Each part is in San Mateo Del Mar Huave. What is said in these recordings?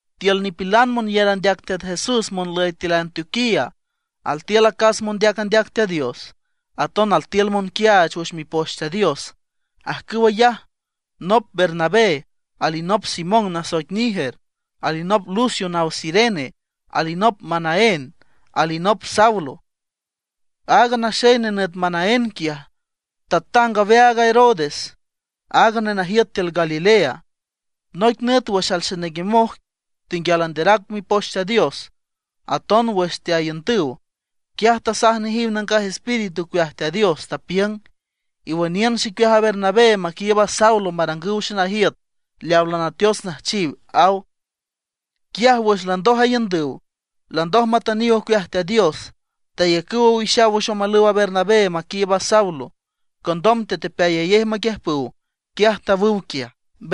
Tiül nipilan monyar andeac Teat Jesús monlüy tiül Antioquía altiül acas mondeac andeac Teat Dios, aton altiül monquiaach wüx Mipoch Teat Dios. Ajcüw ayaj nop Bernabé, alinop Simón nasoic Niger, alinop Lucio naw Cirene, alinop Manaén, alinop Saulo. Aaga naxey nenüt Manaén quiaj, tatang aweaag a Herodes, aaga nenajiüt tiül Galilea. Noic nüt wüx alxenenguemoj tenguial anderac Mipoch Teat Dios aton wüx teaiündüw, quiaj tasaj nejiw Nangaj Espíritu ocueaj Teat Dios, tapiüng: ―Iwüniün xicueaj a Bernabé maquiiüb a Saulo marangüw xenajiüt leawa lanateots nüjchiw ―aw. Quiaj wüx landoj aiündüw, landoj matüniw ocueaj Teat Dios, tayacüw owixaw wüx omalüw a Bernabé maquiiüb a Saulo. Condom tetepeayayej maquiüjpüw, quiaj tawüw quiaj.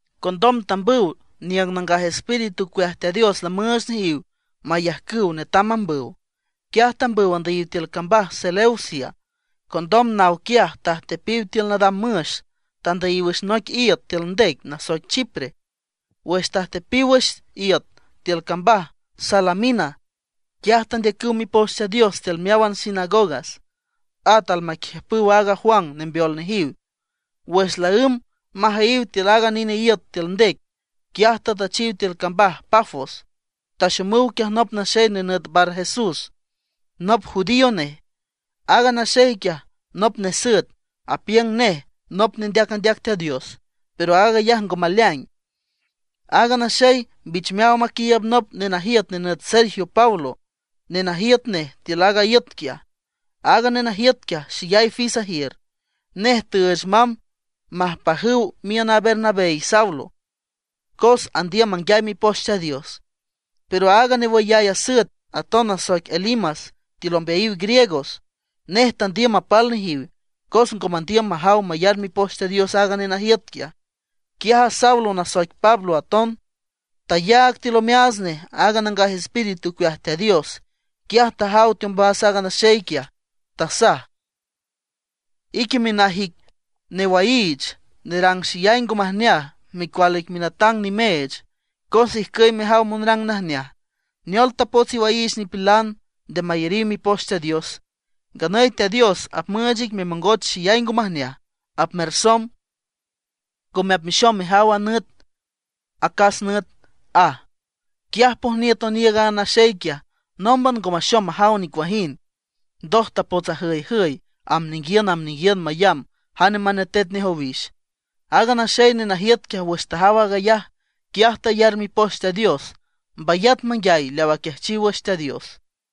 Condom tambüw niüng Nangaj Espíritu ocueaj Teat Dios lamüüch nejiw mayajcüw netam mambüw. Quiaj tambüw andüyiw tiül cambaj Seleucia. Condom nawüw quiaj tajtepiw tiül nadam müx, tandüyiw wüx noic iüt tiül ndec nasoic Chipre. Wüx tajtepiw wüx iüt tiül cambaj Salamina, quiaj tandeacüw Mipoch Teat Dios tiül meáwan sinagogas. At almaquiüjpüw a Juan mambeol nejiw. Wüx laǘmb majüyiw tiül aaga nine iüt tiül ndec, quiaj tatüchiw tiül cambaj Pafos. Taxomüw quiaj nop naxey nenüt Barjesús, nop judío nej. Aaga naxey quiaj nop nesüet, y apiüng nej nop nendeac andeac Teat Dios, pero aag ayaj ngo maleaing. Aaga naxey mbich meaw maquiiüb nop nenajiüt nenüt Sergio Paulo, nenajiüt nej tiül aaga iüt quiaj. Aaga nenajiüt quiaj, xeyay fis ajiür. Nej tüüch mamb majpajüw miün a Bernabé y Saulo, cos andiüm manguiay Mipoch Teat Dios. Pero aaga newüyay asüet aton nasoic Elimas tiül ombeayiw Griegos; nej tandiüm mapal nejiw, cos ngo mandiüm majaw mayar Mipoch Teat Dios aaga nenajiüt quiaj. Quiaj a Saulo nasoic Pablo aton, tayaag tiül omeaats nej a Nangaj Espíritu ocueaj Teat Dios, quiaj tajaw teombas aaga naxey quiaj. Tasaj: ―¡Ique minaj ic newaiich, nerang xeyay ngo majneaj, micual ic minatang nimeech, cos ijcüy mejaw monrang najneaj! ¿Neol tapots iwaiich nipilan nde mayariw Mipoch Teat Dios? Nganüy Teat Dios apmüüch ic memongoch xeyay ngo majneaj, apmersomb, ngome apmexom mejaw a nüt acas nüt ―aj. Quiaj pojniüt oniiüg aaga naxey quiaj, nómban ngo maxom majaw nicuajind. Ndoj tapots ajüyjüy, amb ninguiün amb ninguiün mayamb jane manetet nej owix. Aaga naxey nenajiüt quiaj wüx tajaw aag ayaj, quiaj tayar Mipoch Teat Dios, mbayat manguiay leaw aquiajchiw wüx Teat Dios.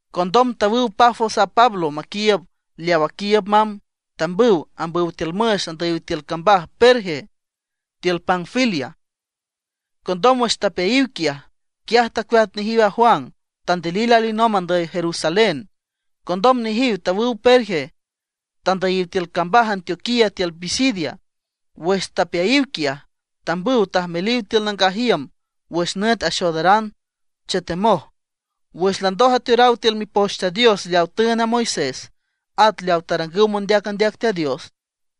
Condom tawüw Pafos a Pablo maquiiüb leaw aquiiüb mamb, tambüw ambüw tiül müx, tandüyiw tiül cambaj Perge tiül Panfilia. Condom wüx tapeayiw quiaj, quiaj tacueat nejiw a Juan, tandilil alinomb andüy Jerusalén. Condom nejiw tawüw Perge, tandüyiw tiül cambaj Antioquía tiül Pisidia. Wüx tapeayiw quiaj, tambüw tajmeliw tiül nangaj iüm wüx nüt axoodaran, chetemoj. Wüx landoj ateoraw tiül Mipoch Teat Dios leaw tüünd a Moisés, at leaw tarangüw mondeac andeac Teat Dios,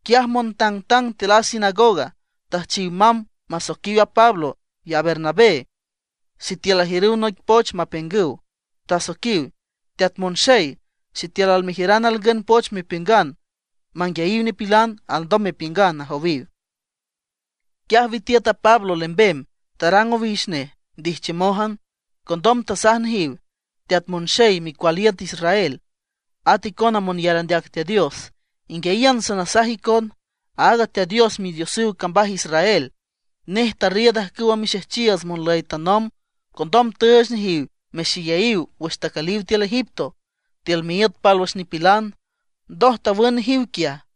quiaj montangtang tiül a sinagoga, tüjchiw mamb masoiquiw a Pablo y a Bernabé sitiül ajiürüw noic poch mapiüngüw. Tasoiquiw: ―Teat monxey, sitiül almejiüran alngün poch mepiüngan manguiayiw nipilan, alndom mepiüngan ―ajowiw. Quiaj witiüt a Pablo lembem, tarang owix nej ndijchiümójan. Condom tasaj nejiw: ―Teat monxey micual iüt Israel, at icona monyar andeac Teat Dios, inguiayiün sanasaj icon: Aaga Teat Dios Midiosüw cambaj Israel, nej tarriiüd ajcüwa mixejchiiüts monlüy tanomb. Condom tüüch nejiw mexeyayiw wüx tacüliw tiül Egipto, tiül miíüt pálwüx nipilan. Ndoj tawün nejiw quiaj.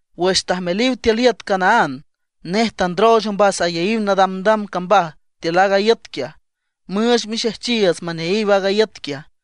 Wüx tajmeliw tiül iüt Canaán, nej tandrooch ombas ayaíw nadamdam cambaj tiül aaga iüt quiaj, müüch mixejchiiüts maneayiw aaga iüt quiaj.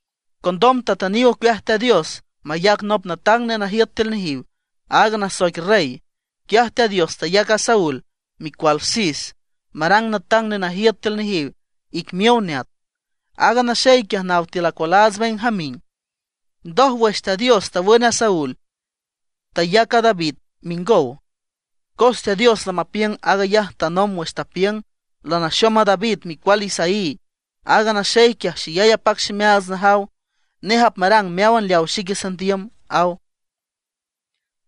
Condom tatüniw ocueaj Teat Dios mayac nop natang nenajiüt tiül nejiw, aaga nasoic rey. Quiaj Teat Dios tayac a Saúl, micual Cis, marang natang nenajiüt tiül nejiw ic miow neat. Aaga naxey quiaj naw tiül acualaats Benjamín. Ndoj, wüx Teat Dios tawün a Saúl, tayac a David mingow. Cos Teat Dios lamapiüng aag ayaj tanomb wüx tapiüng: “Lanaxom a David micual Isaí. Aaga naxey quiaj xeyay apac ximeaats najaw, nej apmarang meáwan leaw xique sandiüm”, aw.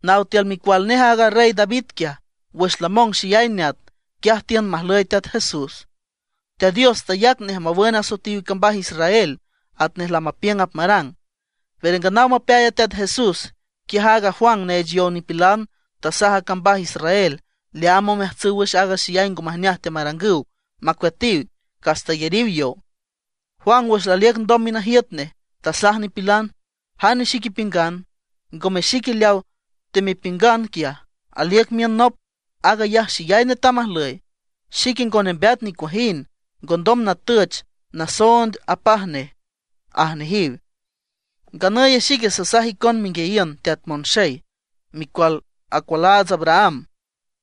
Naw tiül micual nej aaga rey David quiaj, wüx lamong xeyay neat, quiaj tiün majlüy Teat Jesús. Teat Dios tayac nej mawün asoetiw cambaj Israel, atnej lamapiüng apmarang. Pero nganaw mapeay a Teat Jesús, quiaj aaga Juan neech yow nipilan tasaj a cambaj Israel leaam omeajtsüw wüx aaga xeyay ngo majneaj teamarangüw, macueatiw, cas tayariw yow. Juan wüx laliüc ndom minajiüt nej, tasaj nipilan: “¿Jane xic ipiüngan? Ngome xique leawa temepiüngan quiaj. Aliüc miün nop, aag ayaj xeyay netam ajlüy, xique ngo nembeat nicuajind, ngondom natüch nasoond apaj nej”, aj nejiw. ’Nganüy xique sasaj icon menguiayiün Teat monxey, micual acualaats Abraham,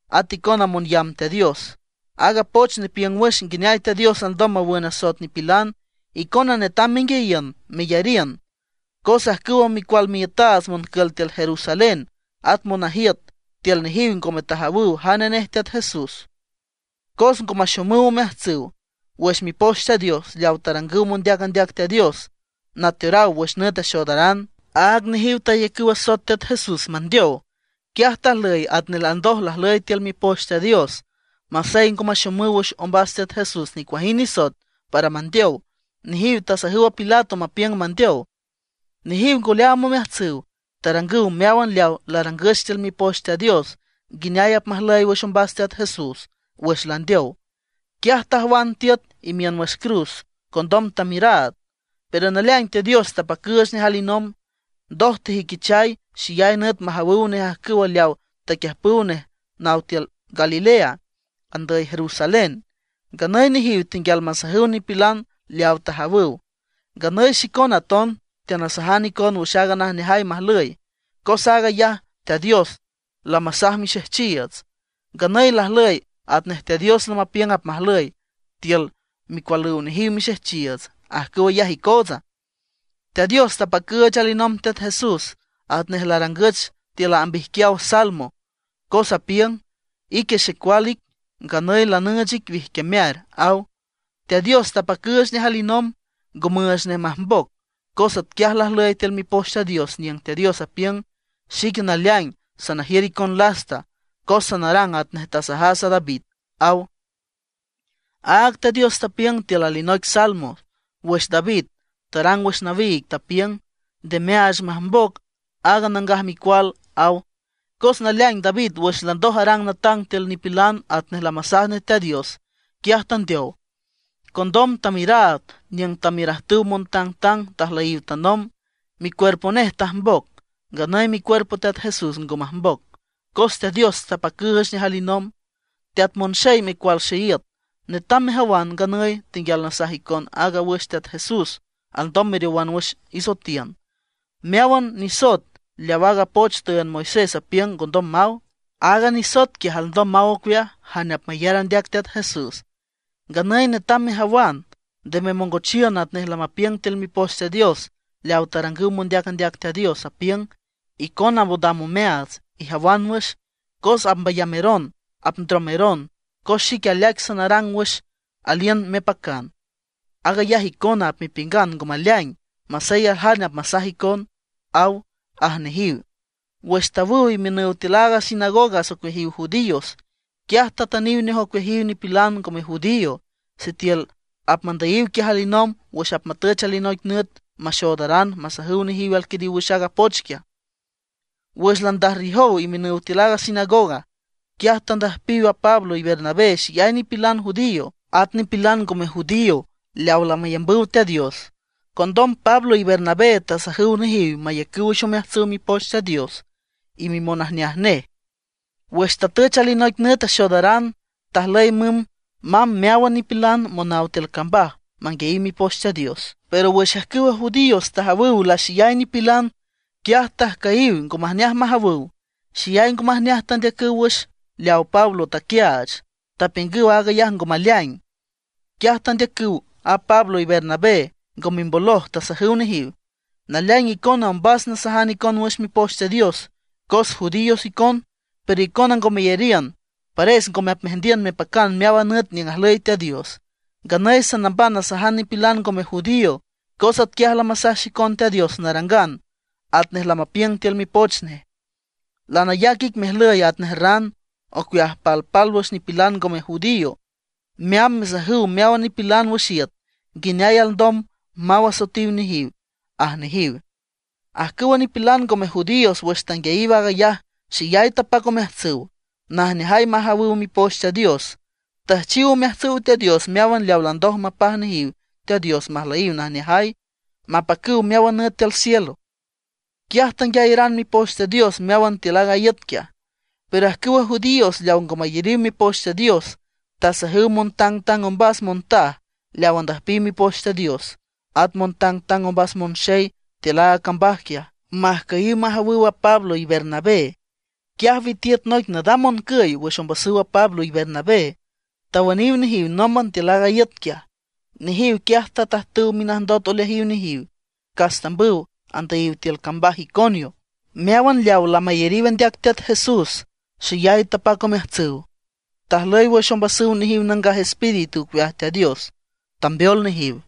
at icona monyamb Teat Dios: Aaga poch nepiüng wüx nguineay Teat Dios alndom mawün asoet nipilan, icona netam menguiayiün, meyariün. Cos ajcüwa micual miiütaats moncül tiül Jerusalén, at monajiüt tiül nejiw ngome tajawüw jane nej Teat Jesús. Cos ngo maxomüw omeajtsüw wüx Mipoch Teat Dios leaw tarangüw mondeac andeac Teat Dios, nateoraw wüx nüt axoodaran. Áag nejiw tayacüw asoet Teat Jesús mandeow. Quiaj tajlüy atnej landoj lajlüy tiül Mipoch Teat Dios. Masey ngo maxomüw wüx ombas Teat Jesús nicuajind nisoet para mandeow, nejiw tasajüw a Pilato mapiüng mandeow. Nejiw ngo leaam omeajtsüw, tarangüw meáwan leaw larangüch tiül Mipoch Teat Dios nguineay apmajlüy wüx ombas Teat Jesús. Wüx landeow, quiaj tajwan tiüt imiün wüx cruz. Condom tamiüraad. Pero naleaing Teat Dios tapacüüch nej alinomb. Ndoj tejüiquichay xeyay nüt majawüw nej ajcüw leawa taquiüjpüw nej naw tiül Galilea, andüy Jerusalén. Nganüy nejiw tenguial masajüw nipilan leaw tajawüw. ’Nganüy xicona aton teanasajan icon wüx aaga najneajay majlüy, cos aag ayaj Teat Dios lamasaj mixejchiiüts. Nganüy lajlüy atnej Teat Dios lamapiüng apmajlüy tiül micualüw nejiw mixejchiiüts; ajcüw ayaj icootsa. Teat Dios tapacüüch alinomb Teat Jesús atnej larangüch tiül amb ijquiaw Salmo, cos apiüng: “Ique Xecual ic, nganüy lanüüch ic wijquiamear”, aw. Teat Dios tapacüüch nej alinomb, ngo müüch nej majmboc, cos atquiaj lajlüy tiül Mipoch Teat Dios, niüng Teat Dios apiüng: “Xique naleaing sanajiür icon lasta, cos sanarang atnej tasajas a David”, aw. Áag Teat Dios tapiüng tiül alinoic Salmo, wüx David tarang wüx nawiig, tapiüng: “Nde meaach majmboc aaga nangaj micual”, aw. Cos naleaing David wüx landoj arang natang tiül nipilan atnej lamasaj nej Teat Dios, quiaj tandeow. Condom tamiüraad niüng tamiürajtüw montangtang tajlüyiw tanomb, micuerpo nej tajmboc. Nganüy micuerpo Teat Jesús ngo majmboc, cos Teat Dios tapacüüch nej alinomb. Teat monxey micual xeíüt, netam mejawan, nganüy tenguial nasajan icon áagan wüx Teat Jesús alndom meriowan wüx isoetiün. Meáwan nisoet leaw aaga poch tüünd Moisés apiüng ngondom maw, aaga nisoet quiaj alndom maw ocueaj jane apmayar andeac Teat Jesús. Nganüy netam mejawan, nde memongochiün atnej lamapiüng tiül Mipoch Teat Dios leaw tarangüw mondeac andeac Teat Dios, apiüng: Icona mondam omeaats, ijawan wüx, cos apmbayameron apndromeron. Cos xique aleaic sanarang wüx aliün mepacan. Aag ayaj icona apmepiüngan ngo maleaing, masey aljane apmasaj icon, aw ―aj nejiw. Wüx tawüw imiünüw tiül a sinagoga ocueajiw judíos, quiaj tatüniw nej ocueajiw nipilan ngome judío, sitiül apmandüyiw quiaj alinomb wüx apmatüch alinoic nüt maxoodaran masajüw nejiw alquiriw wüx aaga poch quiaj. Wüx landajrriüjow imiünüw tiül a sinagoga, quiaj tandüjpiw a Pablo y Bernabé xeyay nipilan judío, at nipilan ngome judío leaw lamayambüw Teat Dios. Condom Pablo y Bernabé tasajüw nejiw mayacüw wüx omeajtsüw Mipoch Teat Dios y mimonajneaj nej. Wüx tatüch alinoic nüt axoodaran, tajlüy mümb mamb meáwan nipilan monaw tiül cambaj manguiayiw Mipoch Teat Dios. Pero wüx ajcüwa judíos tajawüw laxeyay nipilan, quiaj tajcüyiw, ngo majneaj majawüw. Xeyay ngo majneaj tandeacüw wüx leaw Pablo taquiaach, tapiüngüw aag ayaj ngo maleaing. Quiaj tandeacüw a Pablo y Bernabé, ngo mimboloj, tasajüw nejiw: ―Naleaing icona ombas nasajan icon wüx Mipoch Teat Dios cos judíos icon. Pero icona ngo meyariün, pares ngome apmeajndiün mepacan meáwan nüt niüng ajlüy Teat Dios. Nganüy sanamban nasajan nipilan ngome judío. Cos atquiaj lamasaj xicon Teat Dios narangan, atnej lamapiüng tiül Mipoch nej: Lanayac ic mejlüy atnej ran ocueajiw palpálwüx nipilan ngome judío, meamb mesajüw meáwan nipilan wüx iüt nguineay alndom maw asoetiw nejiw ―aj nejiw. Ajcüwa nipilan ngome judíos, wüx tanguiayiw aag ayaj, xeyay tapac omeajtsüw, najneajay majawüw Mipoch Teat Dios. Tüjchiw omeajtsüw Teat Dios meáwan leaw landoj lamapaj nejiw Teat Dios majlüyiw najneajay, mapacüw meáwan nüt tiül cielo. Quiaj tanguiayaran Mipoch Teat Dios meáwan tiül aaga iüt quiaj. Pero ajcüwa judíos leawa ngo mayariw mipoch Teat Dios tasajüw montangtang ombas montaj leaw andüjpiw Mipoch Teat Dios, at montangtang ombas monxey tiül aaga cambaj quiaj, majcüyiw majawüw a Pablo y Bernabé. Quiaj witiüt noic nadam moncüy wüx ombasüw Pablo y Bernabé, tawüniw nejiw nómban tiül aaga iüt quiaj. Nejiw quiaj tatajtüw minajndot oleajiw nejiw, cas tambüw tandüyiw tiül cambaj Iconio. Meáwan leaw lamayariw andeac Teat Jesús xeyay tapac omeajtsüw, tajlüy wüx ombasüw nejiw Nangaj Espíritu ocueaj Teat Dios, tambeol nejiw.